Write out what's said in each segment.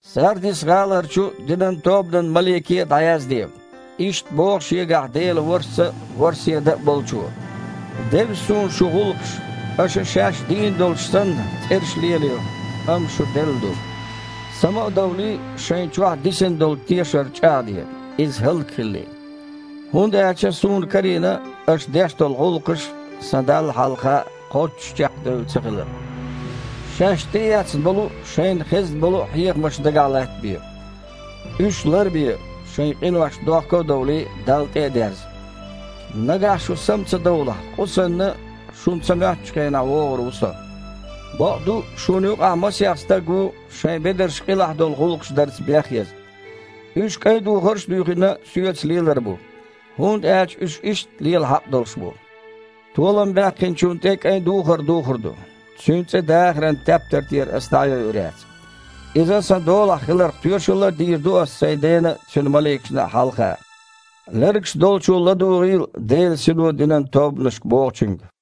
«Сардис-гІаларчу динан тобанан малике а дІаязде: Иштта боху Шегахь Делан ворхІ Са а, ворхІ седа а Болчо: „Девза Суна шун гІуллакхаш. Аша, шаьш дийна долуш санна, цІераш лелайо, амма шу делла ду. Сама а довлий, шайна чохь дисина долу тешар чІагІде, иза хІаллакьхилале. ХІунда аьлча Суна карийна, аша деш долу гІуллакхаш Сан Далла хьалха кхоччуш чекхдевлла цахилар. Шаьш тІеэцна болу а, шайна хезна болу а хьехамаш дагахь латтабе! Уьш лар а бе, шайн къиношна дохко а довлий, Далла тІе а дерза. Нагахь шу сама ца довлахь, къу санна, шуна ца моьттучу хенахь вогІур ву Со. Бакъду, шуна юкъахь масех стаг ву шайн бедарш къилахь долу гІуллакхаш дарца бехъяза. Уьш, кІайн духарш а дуьйхина, Соьца лелар бу, хІунда аьлча уьш иштта лела хьакъ долуш бу. Толам баьккхинчунна тІе кІайн духар духур ду. Цуьнан цІе дахаран тептар тІера Ас дІа а йойур яц. Иза Сан долахь хиларх тоьшалла а дийр ду Ас Сайн Дена а, Цуьнан маликашна а хьалха. Лергаш долчо ладугІийла Делан Сино динан тобанашка бохучуьнга“».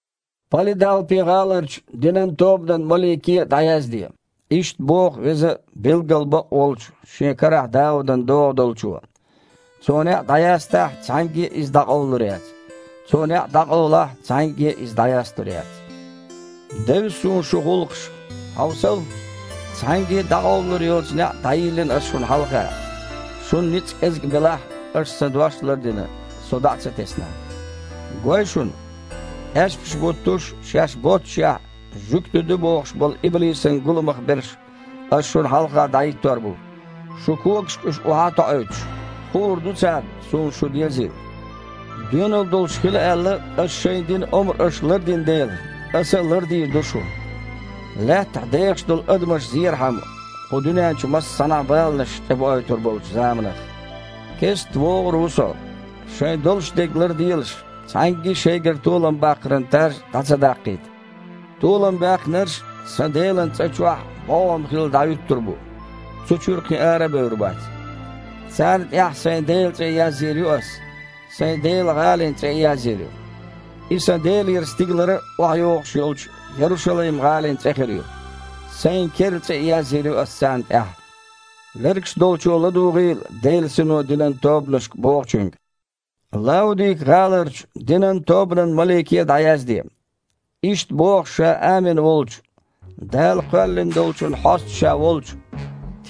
«Палидалпи-гІаларчу динан тобанан малике а дІаязде: Иштта боху веза а, билггал бакъ а волчу Шен карахь Даудан догІа Долчо. Цо неІ дІаястахь, цхьаьнгге а иза дІакъовлалур яц. Цо неІ дІакъовлахь, цхьаьнгге а иза дІаясталур яц. „Девза Суна шун гІуллакхаш. Хьовсал! Цхьаьнгге а дІакъовлалур йоцу неІ дІайиллина Ас шуна хьалха. Шун ницкъ кІезиг белахь а, аша Сан дош а лардина, Со дІа а ца тесна. Гой шуна! Аьшпаш а буттуш, шаьш боццушехь, жуьгти ду бохуш болу иблисан гуламах берш Ас шуна хьалха дІахІиттор бу, шун когашка уьш охьа а тоІуьйтуш. Хуур ду царна, Суна шу дезийла. Доьналла долуш хила аьлла, Аса шайна дина омра аша лардина дела, Аса а лардийр ду шу, лаьттахь дехаш долу адамаш зерхьама, кху дуьнен чу массанхьа а баланаш тІебоуьйтур болчу заманах. Кестта вогІур ву Со. Шайн долуш дерг ларделаш, цхьаьнгге а шайгара толам баккхаран таж дІа ца даккхийта. Толам баьккхинарш Сан Делан цІа чохь бІогІам хилла дІахІуьттур бу, цу чуьра кхин ара а бевр бац. Царна тІехь Сайн Делан цІе а язйийр ю Ас, Сайн Делан гІалин цІе а язйийр ю. Иза Сан Делера стигалара охьайогІуш йолчу Ярушалайм-гІалин цІе хир ю. Сайн керла цІе а язйийр ю Ас царна тІехь. Лергаш долчо ладугІийла Делан Сино динан тобанашка бохучуьнга“». «Лаудика-гІаларчу динан тобанан малике а дІаязде: Иштта боху Ша Амин волчу, Дала кхоьллина долчун Хьоста Ша волчу,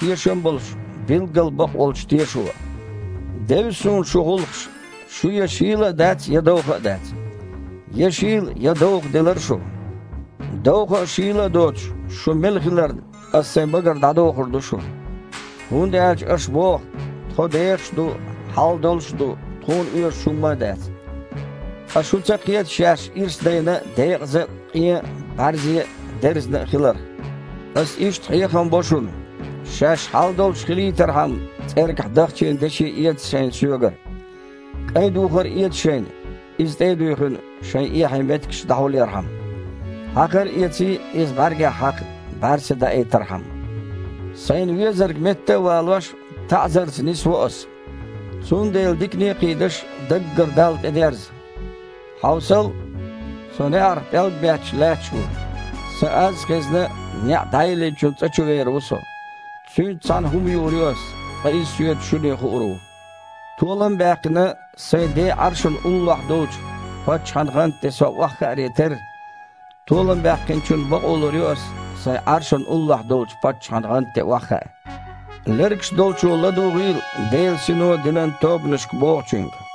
тешам а болуш, билггал бакъволчу Тешо: „Девза Суна шун гІуллакхаш – шу я шийла а дац, я довха а дац. Я шийла, я довха делара шу! Довха а, шийла а доцуш, шу мела хиларна, Ас Сайн багара а дІадохур ду шу. ХІунда аьлча аша боху: «Тхо дехаш а ду, хьал долуш а ду, тхуна оьшуш хІумма а дац». Ткъа шу ца кхета шаьш ирс дайна а, декъаза а, къен а, бІаьрзе а, дерзина а хиларх! Ас иштта хьехам бо шуна: шаьш хьал долуш хилийтархьама, цІергахь дахчийна деши эца шайна Соьгара. КІайн духар а эца шайна, иза, тІе а дуьйхина, шайн эхье меттигаш дІахьулъярхьама! Хьакхар а эций, иза бІаьргех хьакха, бІаьрса даийтархьама! Сайна везарг, метта а валош, таІзарца нисво Ас. Цундела, дикане а кхийдаш, даггара Далла тІедерза! Хьовсал! Со, неІарах пІелг а бетташ, лаьтташ ву. Сан аз а хезна, неІ дІайиллинчун цІа чу вер ву Со. Цуьнца цхьаьна хІума юур ю Ас, ткъа иза Соьца шуьне хуур ву. Толам а баьккхина, Сайн Ден Іаршана уллохь долчу паччахьан гІанта тІе Со охьахааре терра, толам баьккхинчунна бакъо лур ю Ас Сайн Іаршана уллохь долчу паччахьан гІанта тІе охьахаа. Лергаш долчо ладугІийла Делан Сино динан тобанашка бохучуьнга“».